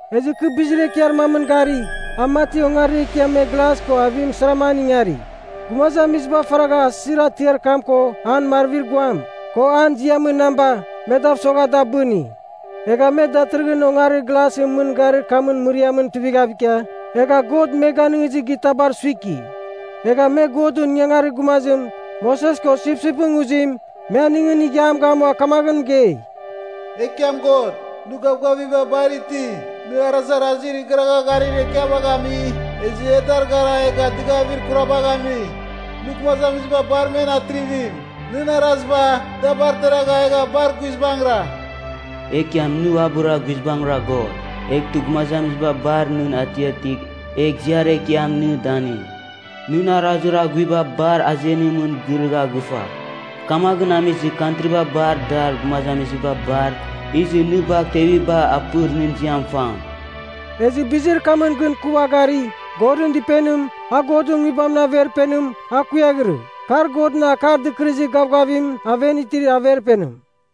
Ezɨ kɨ bizir ekiar mamɨn gari, a mati ongarir ekiam me glas ko avim sarama an ingari. Gumazamiziba faragha asɨzir atiar kam ko an marvir guam, ko an ziamɨn namba, me dav sogha da abɨni. Egha me datɨrɨghɨn ongarir glasɨn mɨn garir kamɨn mɨriamɨn tuivighav ikia, egha God me ganɨngizɨr gitabar suiki. Egha me Godɨn ingangarir gumazim, Moses ko sipsipɨn nguzim, me aningɨn ighiam gamua kamaghɨn mɨgei, “Ekiam God, nɨ gavgaviba bar iti! Nɨ arazarazir igharagha garir ekiabagh ami, ezɨ e dar gara egha dɨgavir kurabagh ami! Nɨ gumazamiziba bar men atrivim! Nɨn araziba, da bar deragha egha bar guizbangɨra! Ekiam nɨ uabɨra guizbangɨra God. Eghtɨ gumazamiziba bar nɨn atiatigh egh ziar ekiam nɨ danɨng. Nɨn arazir aghuiba bar azenim girɨgha gɨfa, kamaghɨn amizɨ kantriba bar dar gumazamiziba bar izɨ nɨ bagh teviba apɨr nɨn ziam fam.” Ezɨ bizir kamɨn gɨn kɨ ua gari, Godɨn Dɨpenim, a Godɨn Nguibamɨn Averpenim, a kuiaghirɨ. Kar Godɨn Akar Dɨkɨrɨzir Gavgavim aven itir Averpenim.